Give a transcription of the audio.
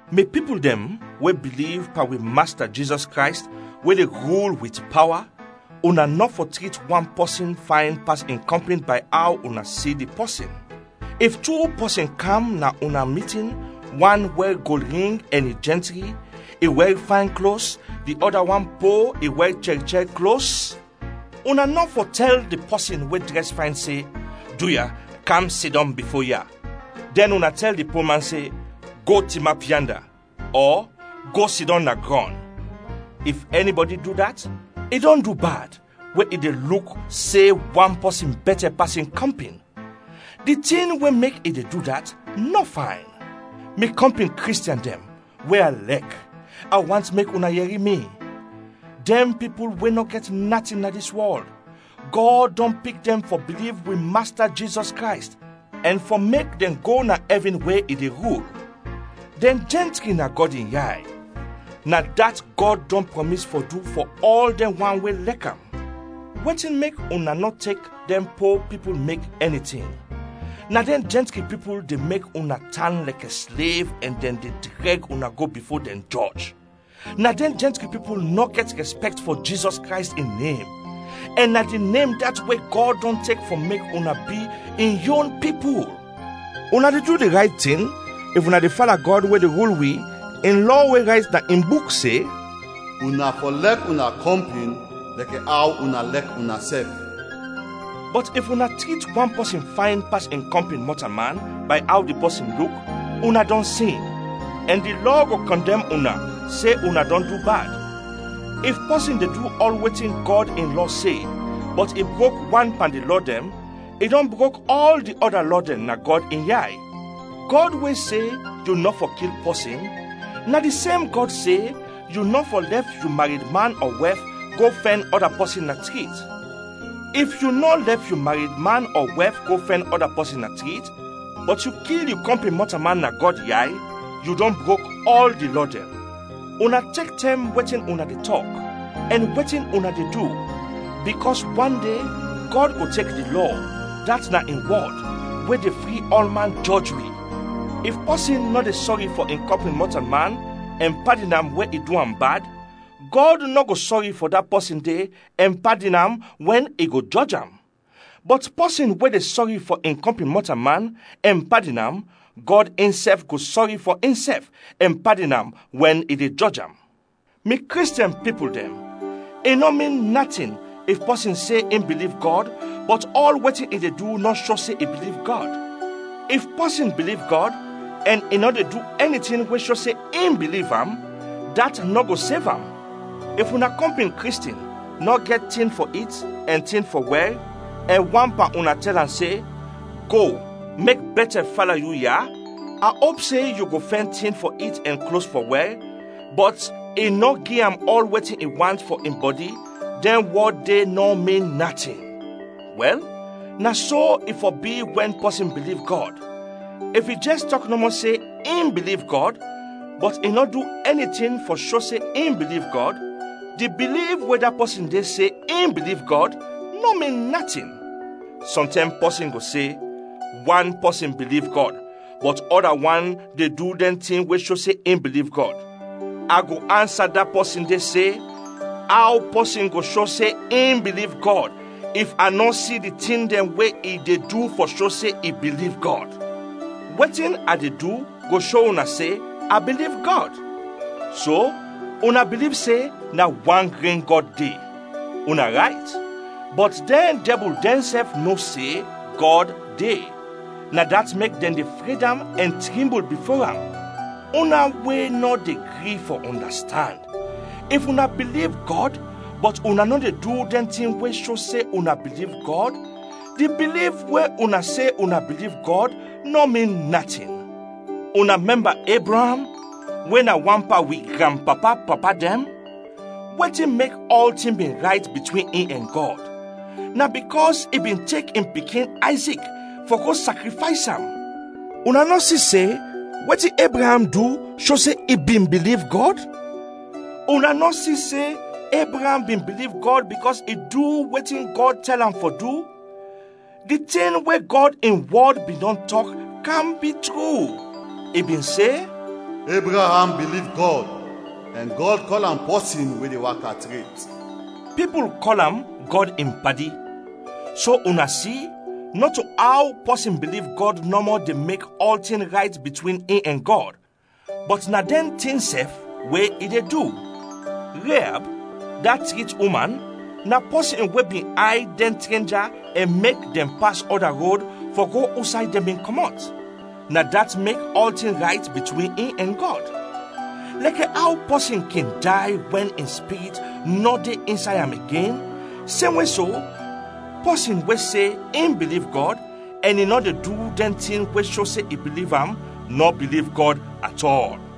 Mi pipul dɛn we biliv pan wi Masta Jizɔs Krays we de rul wit pawa, una nɔ fɔ trit wan pɔsin fayn pas in kɔmpin bay aw una si di pɔsin. If tu pɔsin kam na una mitin, wan wɛr gold ring ɛn i jɛntri, i wɛr fayn klos; di ɔda wan po, i wɛr chɛr chɛr klos, una nɔ fɔ tɛl di pɔsin we drɛs fayn se, “Duya, kam sidɔm bifo ya!” dɛn una tɛl di poman se, “Go, tinap yanda!” ɔ “Go, sidɔm na grɔn!” If ɛnibɔdi du dat, i dɔn du bad we i de luk se wan pɔsin bɛtɛ pas in kɔmpin. Di tin we mek i de du dat nɔ fayn. Mi kɔmpin Kristiɛn dɛn we a lɛk, a want mek una yɛri mi! Dɛn pipul we nɔ gɛt natin na dis wɔl, Gɔd dɔn pik dɛn fɔ biliv wi Masta Jizɔs Krays ɛn fɔ mek dɛn go na ɛvin we i de rul; dɛn jɛntri na Gɔd in yay. Na dat Gɔd dɔn prɔmis fɔ du fɔ ɔl dɛn wan we lɛk am. Wetin mek una nɔ tek dɛn po pipul mek ɛni tin? Na dɛn jɛntri pipul de mek una tan lɛkɛ slev ɛn na dɛn de drɛg una go bifo dɛn jɔj. Na dɛn jɛntri pipul nɔ gɛt rɛspɛkt fɔ Jizɔs Krays in nem. Ɛn na di nem dat we Gɔd dɔn tek fɔ mek una bi in yon pipul. Una de du di rayt tin if una de fala Gɔd, we de rul wi in lɔ we rayt na in Buk se, “Una fɔ lɛk una kɔmpin, lɛkɛ aw una lɛk unasɛf.” Bɔt if una trit wan pɔsin fayn pas in kɔmpin mɔtalman bay aw di pɔsin luk, una dɔn sin, ɛn di lɔ go kɔndɛm una, se una dɔn du bad. If pɔsin de du ɔl wetin Gɔd in Lɔ se, bɔt i brok wan pan di lɔ dɛn, i dɔn brok ɔl di ɔda lɔ dɛn na Gɔd in yay. Gɔd we se, “Yu nɔ fɔ kil pɔsin,” na di sem Gɔd se, “Yu nɔ fɔ lɛf yu mared man ɔ wɛf go fɛn ɔda pɔsin na trit.” If yu nɔ lɛf yu mared man ɔ wɛf go fɛn ɔda pɔsin na trit, bɔt yu kil yu kɔmpin mɔtalman, na Gɔd yay, yu dɔn brok ɔl di lɔ dɛn. Una tek tɛm wetin una de tɔk ɛn wetin una de du, bikɔs wan de Gɔd go tek di lɔ, dat na in wɔd, we de fri ɔlman, jɔj wi. If pɔsin nɔ de sɔri fɔ in kɔmpin mɔtalman ɛn padin am wɛn i du am bad, Gɔd nɔ go sɔri fɔ da pɔsin de ɛn padin am wɛn i go jɔj am. Bɔt pɔsin we de sɔri fɔ in kɔmpin mɔtalman ɛn padin am, Gɔd insɛf go sɔri fɔ insɛf ɛn padin am wɛn i de jɔj am. Mi Kristiɛn pipul dɛn, i nɔ min natin if pɔsin se in biliv Gɔd bɔt ɔl wetin i de du nɔ sho se i biliv Gɔd. If pɔsin biliv Gɔd ɛn i nɔ de du ɛni tin we sho se in biliv am, dat nɔ go sev am. If una kɔmpin Kristiɛn nɔ gɛt tin fɔ it ɛn tin fɔ wɛr, ɛn wan pan una tɛl am se, “Go, mek bɛtɛ fala yu ya, a op se yu go fɛn tin fɔ it ɛn klos fɔ wɛr,” bɔt i nɔ gi am ɔl wetin i want fɔ in bɔdi, dɛn wɔd de nɔ min natin! Wɛl, na so i fɔ bi wɛn pɔsin biliv Gɔd. If i jɛs tɔk nɔmɔ se in biliv Gɔd, bɔt i nɔ du ɛni tin fɔ sho se in biliv Gɔd, di biliv we da pɔsin de se in biliv Gɔd, nɔ min natin! Sɔntɛm pɔsin go se, “Wan pɔsin biliv Gɔd, bɔt ɔda wan de du dɛn tin we sho se i biliv Gɔd.” A go ansa da pɔsin de se, “Aw pɔsin go sho se in biliv Gɔd if a nɔ si di tin dɛn we i de du fɔ sho se i biliv Gɔd? Wetin a de du go sho una se a biliv Gɔd.” So, una biliv se na wan gren Gɔd de. Una rayt! Bɔt dɛn dɛbul dɛnsɛf no se Gɔd de, na dat mek dɛn de fred am ɛn trimbul bifo am. Una we nɔ de gri fɔ ɔndastand! If una biliv Gɔd, bɔt una nɔ de du dɛn tin we sho se una biliv Gɔd, di biliv we una se una biliv Gɔd, nɔ min natin. Una mɛmba Ebraam we na wan pan wi granpapa-papa dɛn; wetin mek ɔltin bin rayt bitwin in ɛn Gɔd? Na bikɔs i bin tek in pikin Ayzik fɔ go sakrifays am. Una nɔ si se wetin Ebraam du sho se i bin biliv Gɔd? Una nɔ si se Ebraam bin biliv Gɔd bikɔs i du wetin Gɔd tɛl am fɔ du? Di tin we Gɔd in wɔd bin dɔn tɔk kam bi tru. I bin se, “Ebraam biliv Gɔd ɛn Gɔd kɔl am pɔsin we de waka tret.” Pipul kɔl am Gɔd in padi. So una si, nɔto aw pɔsin biliv Gɔd nɔmɔ de mek ɔltin rayt bitwin in ɛn Gɔd, bɔt na dɛn tin sɛf we i de du. Reab, da trit uman, na pɔsin we bin ayd dɛn trenja ɛn mek dɛn pas ɔda rod fɔ go usay dɛn bin kɔmɔt; na dat mek ɔltin rayt bitwin in ɛn Gɔd. Lɛkɛ aw pɔsin kin day wɛn in spirit nɔ de insay am igen, semwe so, pɔsin we se in biliv Gɔd ɛn i nɔ de du dɛn tin we sho se i biliv am, nɔ biliv Gɔd at ɔl.